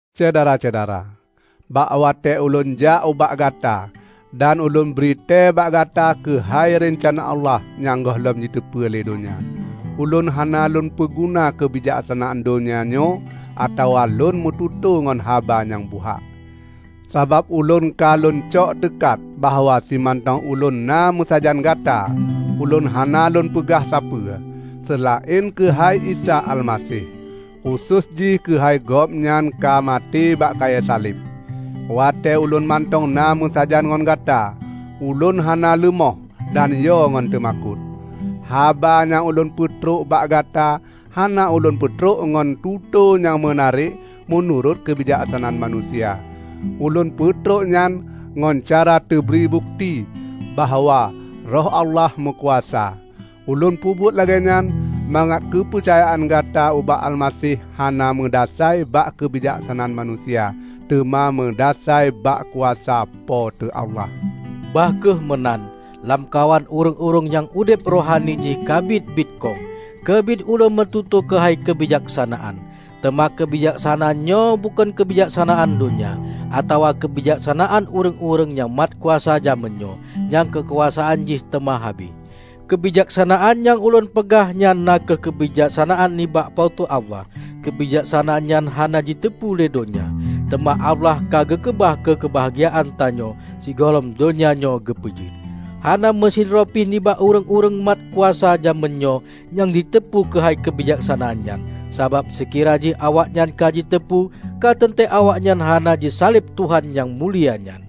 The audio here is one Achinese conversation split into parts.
Syedara-syedara! Bak watée ulôn jak ubak gata dan ulôn britée bak gata keuhai reuncana Allah nyang gohlom jiteupeue lé donya, ulôn hana lônpeuguna keubijaksanaan donya nyoe atawa lôn meututoe ngon haba nyang buhak. Sabab ulôn ka lôncok teukat bahwa simantong ulôn na meusajan gata, ulôn hana lôn peugah sapeue, seulaén keuhai Isa Almaseh; khusos jih keuhai Gobnyan ka maté bak kayée saleb. Watée ulôn mantong na meusajan ngon gata, ulôn hana leumoh dan yo ngon teumakot. Haba nyang ulôn peutrok bak gata hana ulôn peutrok ngon tutoe nyang meunarek meunurot keubijaksanaan manusia. Ulôn peutrok nyan ngon cara teubri bukeuti bahwa Roh Allah meukuasa. Ulôn peubuet lagée nyan, mangat keupeucayaan gata ubak Almaseh hana meudasai bak keubijaksanaan manusia, teuma meudasai bak kuasa Po teu Allah. Bah kheueh meunan, lamkawan ureuëng-ureuëng nyang udeb rohani jih ka biet-biet kong, keubiet ulôn meututoe keuhai keubijaksanaan. Teuma keubijaksanaan nyoe bukon keubijaksanaan donya, atawa keubijaksanaan ureuëng-ureuëng nyang mat kuasa jamén nyoe, nyang keukuasaan jih teuma habéh. Keubijaksanaan nyang ulôn peugah nyan na kheueh keubijaksanaan nibak Po teu Allah. Keubijaksanaan nyan hana jiteupeu lé donya, teuma Allah ka geukeubah keu keubahgiaan tanyoe sigohlom donya nyoe geupeujeuet. Hana meusidroe pih nibak ureuëng-ureuëng mat kuasa jamén nyoe nyang jiteupeu keuhai keubijaksanaan nyan. Sabab, seukira jih awaknyan ka jiteupeue, ka teuntée awaknyan hana jisaleb Tuhan nyang mulia nyan.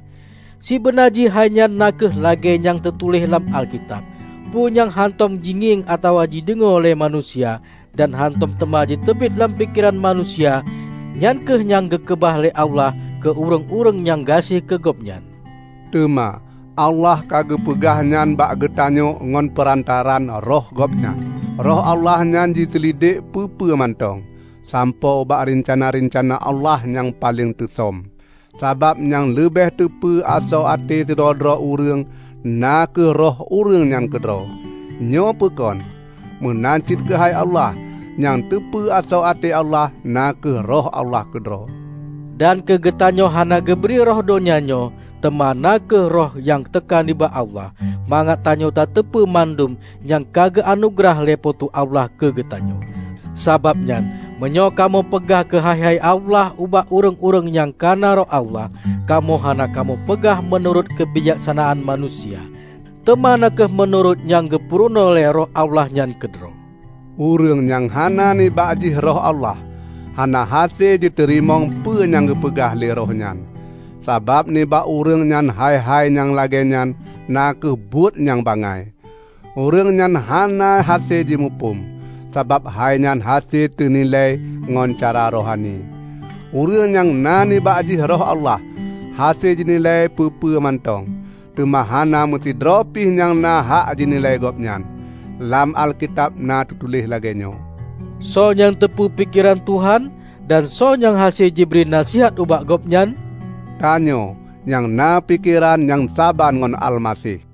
Sibeuna jih hainyan na kheueh lagée nyang teutuléh lam Alkitab, "Peue nyang hántom jingieng atawa jideungoe lé manusia, dan hántom teuma jiteubiet lam pikeran manusia, nyan kheueh nyang geukeubah lé Allah keu ureuëng-ureuëng nyang gaséh keu Gobnyan." Teuma Allah ka geupeugah nyan bak geutanyoe ngon peurantaraan Roh Gobnyan. Roh Allah nyan jiseulidek peue-peue mantong, sampoe ubak reuncana-reuncana Allah nyang paleng teusöm. Sabab nyang leubeh teupeu asoe até sidroe-droe ureuëng na kheueh roh ureuëng nyan keudroe, nyoe peukon? Meunan cit keuhai Allah. Nyang teupeu asoe até Allah na kheueh Roh Allah keudroe! Dan keugeutanyoe hana geubri roh donya nyoe, teuma na kheueh Roh nyang teuka nibak Allah, mangat tanyoe tateupeue mandum nyang ka geuanugeurah lé Po teu Allah keugeutanyoe. Sabab nyan, meunyoe kamoe peugah keuhai-hai Allah ubak ureuëng-ureuëng nyang ka na Roh Allah, kamoe hana kamoe peugah meunurot keubijaksanaan manusia, teuma na kheueh meunurot nyang geupurunoe lé Roh Allah nyan keudroe. Ureuëng nyang hana nibak jih Roh Allah, hana hase jiteurimong peue nyang geupeugah lé Roh nyan. Sabab nibak ureuëng nyan hai-hai nyang lagée nyan na kheueh buet nyang bangai. Ureuëng nyan hana hase jimuphom, sabab hainyan hase teunilai ngon cara rohani. Ureuëng nyang na nibak jih Roh Allah hase jinilai peue-peue mantong, teuma hana meusidroe pih nyang na hak jinilai Gobnyan. Lam Alkitab na teutuléh lagée nyoe, "Soe nyang teupeu pikeran Tuhan? Dan soe nyang hase jibri naseuhat ubak Gobnyan?" Tanyoe nyang na pikeran nyang saban ngon Almaseh!